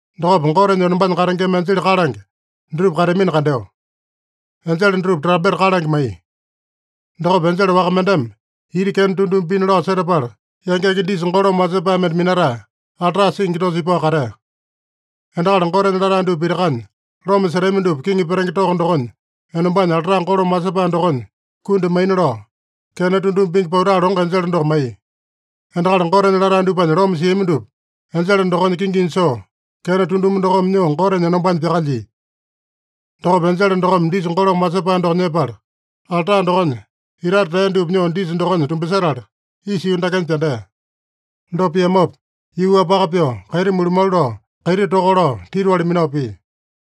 Dokopa Gotenya enombanya katengema enjele kalange dutupa kateamino kandeo. Enjele dutupa trampeta kalange maiya. Dokopa enjele waka mendeme ita kena tunduma pina lao setapala, yangenge disa golome wasepae mende minatae, alta singi dosa ipao katea. Endakali Gotenya latae dupa pitakanya loma setami dupa kiŋi petenge toko dokonya enombanya alta golome wasepae dokonya kundi maina lao, kena tunduma pingi pauta longo enjele doko maiya. Endakali Gotenya latae dupanya loma siami dupa enjele dokonya kinginya soo, kena tunduma dokome nyoo Gotenya enombanya pyakalyia. Dokopa enjele dokome disa golome wasepae doko nyepala, alta dokonya itate tea dupa nyoo disa dokonya tumbasetala, isa yuu dakenya pyandea. Dopa piamopa, yuu-wapaka pyoo, kaiti mulumalu lao, kaiti toka lao, titiwali minao pia.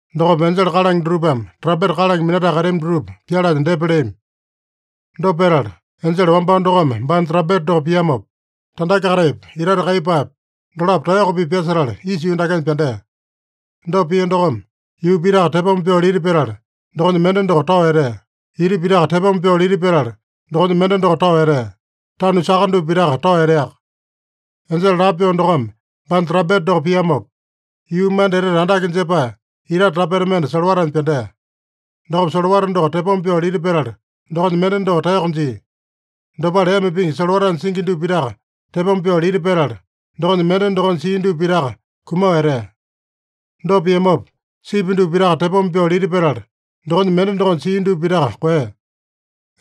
Dokopa enjele kalange dutupame trampeta kalange minatae kateami dutupa pyalanya depa leami. Dopa petala, enjele wambao dokome baanya trampeta doko piamopa, tandake-kataipa, itate kaiyepaepa, dolapo taeyoko-pipa pyasetala isa yuu dakenya pyandea. Dopa pia dokome, yuu pitaka tepoma pyoo lita petala, dokonya mende doko tao etea. Ita pitaka tepoma pyoo lita petala, dokonya mende doko tao etea. Tanu saka dupa pitaka tao eteaka. Enjele lapo pyoo dokome baanya trampeta doko piamopa, yuu manda etete andake jepae itate tapeta mende solowatanya pyandea. Dokopa solowata doko tepoma pyoo lita petala, dokonya mende doko taeyoko jia. Dopale ema pingi solowatanya singi dupa pitaka tepoma pyoo lita petala, dokonya mende dokonya sia dupa pitaka kumao etea. Dopa piamopa, sipi dupa pitaka tepoma pyoo lita petala, dokonya mende dokonya sia dupa pitaka koeya.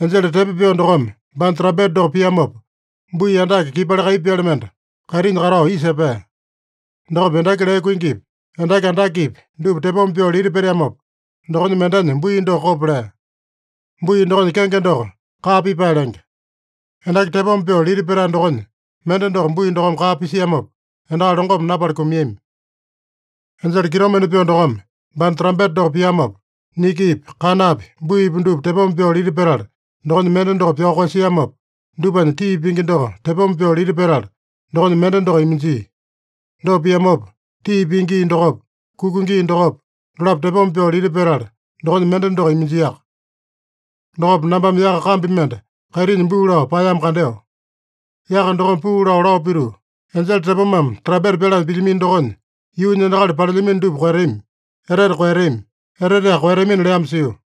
Enjele tepo pyoo dokome baanya trampeta doko piamopa, bui andake kipali kaiyepaele mende kaitinya katao isa epea. Dokopa endaki lee kuingipi, endaki andakepi, dupa tepoma pyoo lita peteamopa, dokonya mendenya bui doko kopo lea. Bui dokonya kenge doko Kaa Pipae lenge. Endaki tepoma pyoo lita petae dokonya mende doko bui dokome kaa pisiamopa, endakali longome napala kumiami. Enjele kitomende pyoo dokome baanya trampeta doko piamopa, nikipi, kanapi, buipi dupa tepoma pyoo lita petala, dokonya mende doko pyao koeyasiamopa, dupanya tii pingi doko tepoma pyoo lita petala, dokonya mende doko iminjia. Dopa piamopa, tii pingi gii dokopa, kuka gii dokopa, dolapo tepoma pyoo lita petala, dokonya mende doko iminjiaka. Dokopa nambame yaka kambi mende kaitinya buu lao paeyamo kandeo. Yaka dokome puu lao, lao pituu, “Enjele tepomame trampeta pyalanya pilyamino dokonya, yuunya endakali palelyamino dupa koeyatami, etete koeyatami, eteteaka koeyatamina” leamo sio.